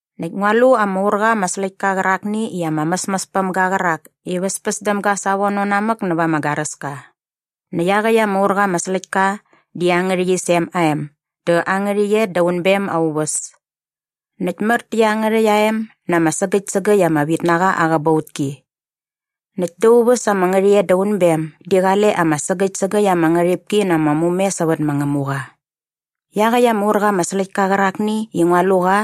Näkt ngua lu ama ur qa ama släktka qärakni i ama mäsmäs päm ga qärak i väspäs däm ga savono namäk näva ama garäska. Näkt iaqäkt ama ur qa ama släktka di aa ngärhäqyisem aa em dä aa ngärhäqyet da unbem aa uväs. Näkt mär tä iangärhäkt aa em na ama sägäkt sägäkt ama vitnaqa aa qäbautki. Näkt da aa uväs ama ngärhäqyet da unbem di qale ama sägäkt sägäkt ama ngärhipki na ama mume sävät ma Ngämuqa. Iaqäkt ama ur qa ama släktka qärakni i ngua lu qa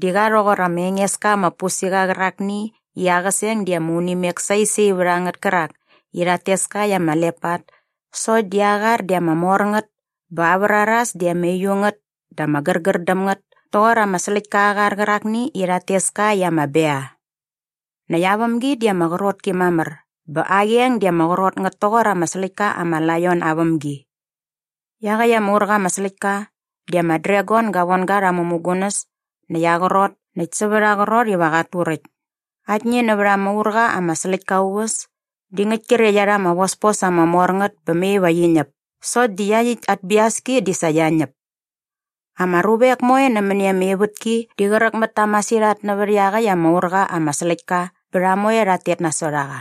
di qa rhoqor ama enges ka ama pusiqa qärakni i aa qäseng di ama unimek saisai vät a ngät kärak i rhat tes ka i ama lepat sokt di aa qar di ama mor ngät bä aa vraras di ama uiu ngät dä ama gärgär däm ngät toqor ama släktka aa qar qärakni i rhat tes ka i ama bea. Näkt aa vämgi di ama qrot ki mamär bä aa qeng di ama qrot ngät toqor ama släktka ama laion aa vämgi. Iaqäkt ama ur qa ama släktka di ama dragon ga von ga rha aa mämugunäs näkt aa qrot näkt sävät aa qrot iva qat turäkt. Aktni nävät ama ur qa ama släktka aa uväs di ngäkt kre qia rha ama vospos ama mor ngät bä mai va qi ñäp sokt di iaqyäkt at biaski di sa qia ñäp. Ama ruvek moe nämäni ama ivätki di qräk mät ta masirhat nävät iaqäkt ama ur qa ama släktka bä rha moe rhat tet nasot a qa.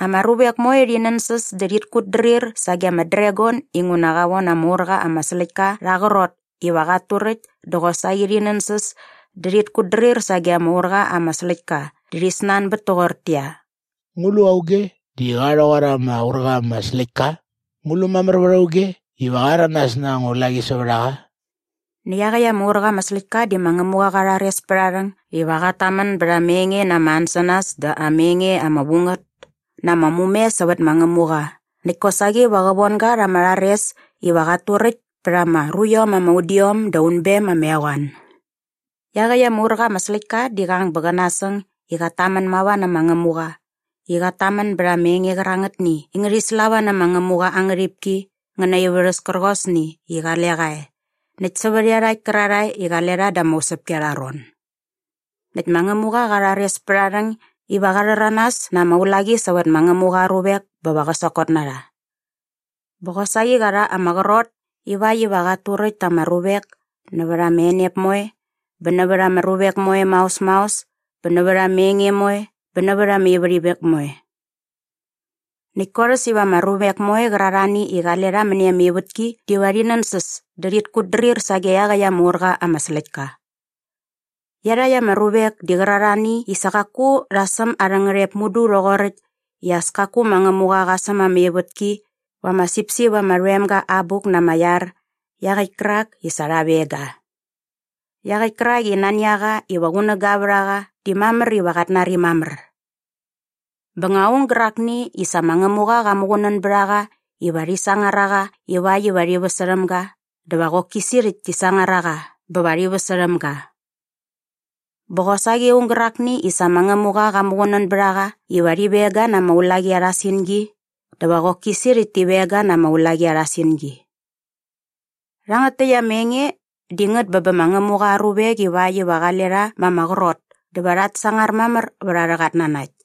Ama ruvek moe rhi nänsäs dä rhit kutdrir sage ama dragon inguna qa von ama ur qa ama släktka rha aa qrot iva qat turäkt dä qosaqi rhi nänsäs dä rhit kutdrir sage ama ur qa ama släktka dä rhi snanbät toqortäqyia, “Ngu lu auge di qa rhoqor ama ur qa ama släktka? Ngu lu mamär vät auge iva qa rhäranas na anga ulaqi sävät a qa?” Näkt iaqäkt ama ur qa ama släktka di ma Ngämuqa qa rhares pät aa rhäng iva qat tamän bät ama enge na ama ansänas dä ama enge ama vu ngät na ama mume sävät ma Ngämuqa näkt kosaqi qa von ga rha ama rhares iva qat turäkt pät ama ruiom ama udiom da unbem ama eqoan. Iaqäkt ama ur qa ama släktka di qa qang bä qä nasäng i qat tamän mava nä ma Ngämuqa i qat tamän bät ama enge qärangätni i ngärhi slava nä ma Ngämuqa aa ngärhipki ngä na aa ivärhäs kärqosni i qale qa e näkt sävät iarhakt kärarhae i qale rha da ama usäpki arha ron. Näkt ma Ngämuqa qa rhares pät aa rhäng iva qa rhäranas na ama ulaqi sävät ma Ngämuqa aa ruvek bä va qä sokot na rha. Bä qosaqi qa rha ama qrot ivakt iva qat turäkt ta ama ruvek nävät ama enep moe bä nävät ama ruvek moe maos maos bä nävät ama enge moe bä nävät ama ivärhimek moe. Näkt korhäs iva ama ruvek moe qärarhani i qale rha mäni ama ivätki diva rhi nänsäs dä rhit kutdrir sage iaqäkt ama ur qa ama släktka. Iarhakt ama ruvek di qärarhani i sa qaku rha säm arhä ngärhep mudu rhoqoräkt i as kaku ma Ngämuqa qa säm ama ivätki va ama sipsip ama rhoem ga aa abuk na ama iar iaqäkt kärak i sa rha veng ga. Iaqäkt kärak i nani a qa iva qunäga vät a qa di mamär iva qat nari mamär. Bä nga aung gärakni i sa ma Ngämuqa qa muqunän bät a qa iva rhi sangar a qa ivakt iva rhi väsärhäm ga dä va qoki sirhäkt ti sangar a qa bä va rhi väsärhäm ga. Bä qosaqi aung gärakni i sa ma Ngämuqa qa muqunän bät a qa iva rhi veng ga na ama ulaqi arha singi dä va qoki sirhäkt ti veng ga na ama ulaqi arha singi. Rhangät täkt ama enge di ngät bä bä ma Ngämuqa aa ruvek ivakt iva qale rha ma ama qrot dä va rhat sangar mamär vät arhä qatnanakt.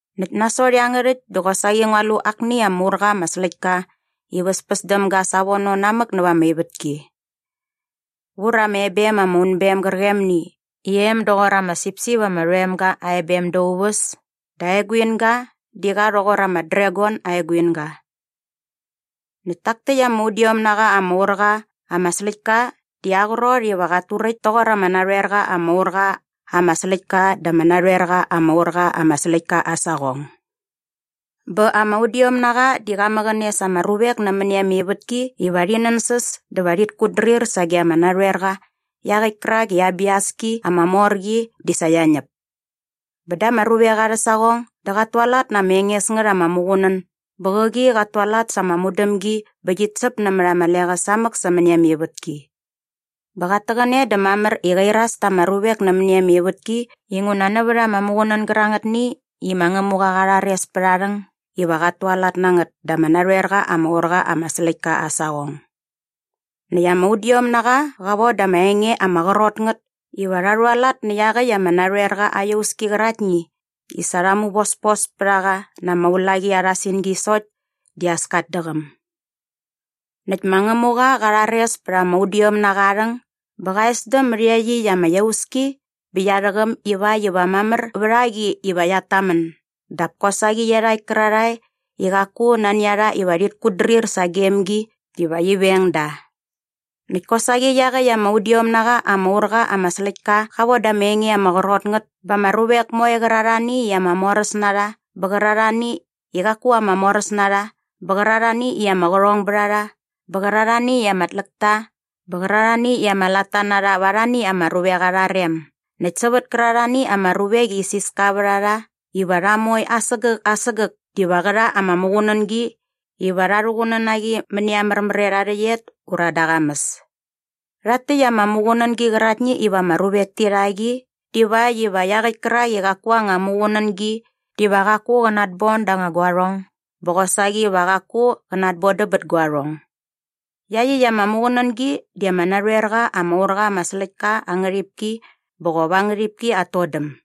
Näkt nasot iangärhäkt dä qosaqi ngua lu akni ama ur qa ama släktka i väspäs däm ga savono namäk näva ama ivätki. Vur ama ebem ama unbem gärqemni i em doqor ama sipsip ama rhoem ga aa ebem da aa uväs dä aa eguinga di qa rhoqor ama dragon aa eguinga. Näkt tak täkt ama udiom na qa ama ur qa ama släktka di aa qrot iva qat turäkt toqor ama narhoer qa ama ur qa ama släktka da ama narhoerqa ama ur qa ama släktka aa saqong. Bä ama udiomnaqa di qa mäqäne sa ama ruvek nämäni ama ivätki iva rhi nänsäs dä va rhit kutdrir sage ama narhoerqa iaqäkt kärak i aa biaski ama mor qi di sa qia ñäp. Bä da ama ruvek arhä saqong dä qat tualat na ama enges ngät ama muqunän bä qäqi qat tualat sa ama mudämgi bä qit säp nämät ama leqäs samäk sämäni ama ivätki. Bä qat täqäne dä mamär i qa iras ta ama ruvek nämäni ama ivätki inguna nävät ama muqunän gärangätni i ma Ngämuqa qa rhares pät aa rhäng iva qat tualat na ngät da ama narhoerqa ama ur qa ama släktka aa saqong. Näkt ama udiomnaqa qa von da rha ama enge ama qrot ngät iva rha rhualat nä iaqäkt ama narhoerqa aa iauski qärakni i sa rha muvospos pät a qa na ama ulaqi arha singi sokt di as kat däqäm. Näkt ma Ngämuqa qa rhares pät ama udiomnaqa aa rhäng bä qa esdäm mät iaqyäkt ama iauski bä qia rhäqäm ivakt iva mamär vät a qi iva qiat tamän dap kosaqi va iarhakt kärarhae i qaku nani a rha iva rhit kutdrir sagem gi diva qi veng da. Näkt kosaqi iaqäkt ama udiom na qa ama ur qa ama släktka qa von da ama enge ama qrot ngät ba ama ruvek moe qärarhani i ama moräs na rha bä qärarhani i qaku ama moräs na rha bä qärarhani i ama qärhongbärharha bä qärarhani i ama tläkta bä qärarhani i ama latta na rha va arhani ama ruvek arha rem näkt sävät kärarhani ama ruvek i isiska vät a rha iva rha moe asägäk asägäk diva qä rha ama muqunängi iva rha rhuqunän na qi mäni aa märmär et aa rhäqyet ura da aa qamäs. Rhakt täkt ama muqunängi qäraktni iva ama ruvek ti rha qi divakt iva iaqäkt kärak i qaku aa anga muqunängi diva qaku qä natbon da anga guarhong bä qosaqi va qaku qä natbodäm bät guarhong. Iaqyäkt ama muqunängi di ama narhoer qa ama ur qa ama släktka aa ngärhipki bä qop aa ngärhipki at todäm.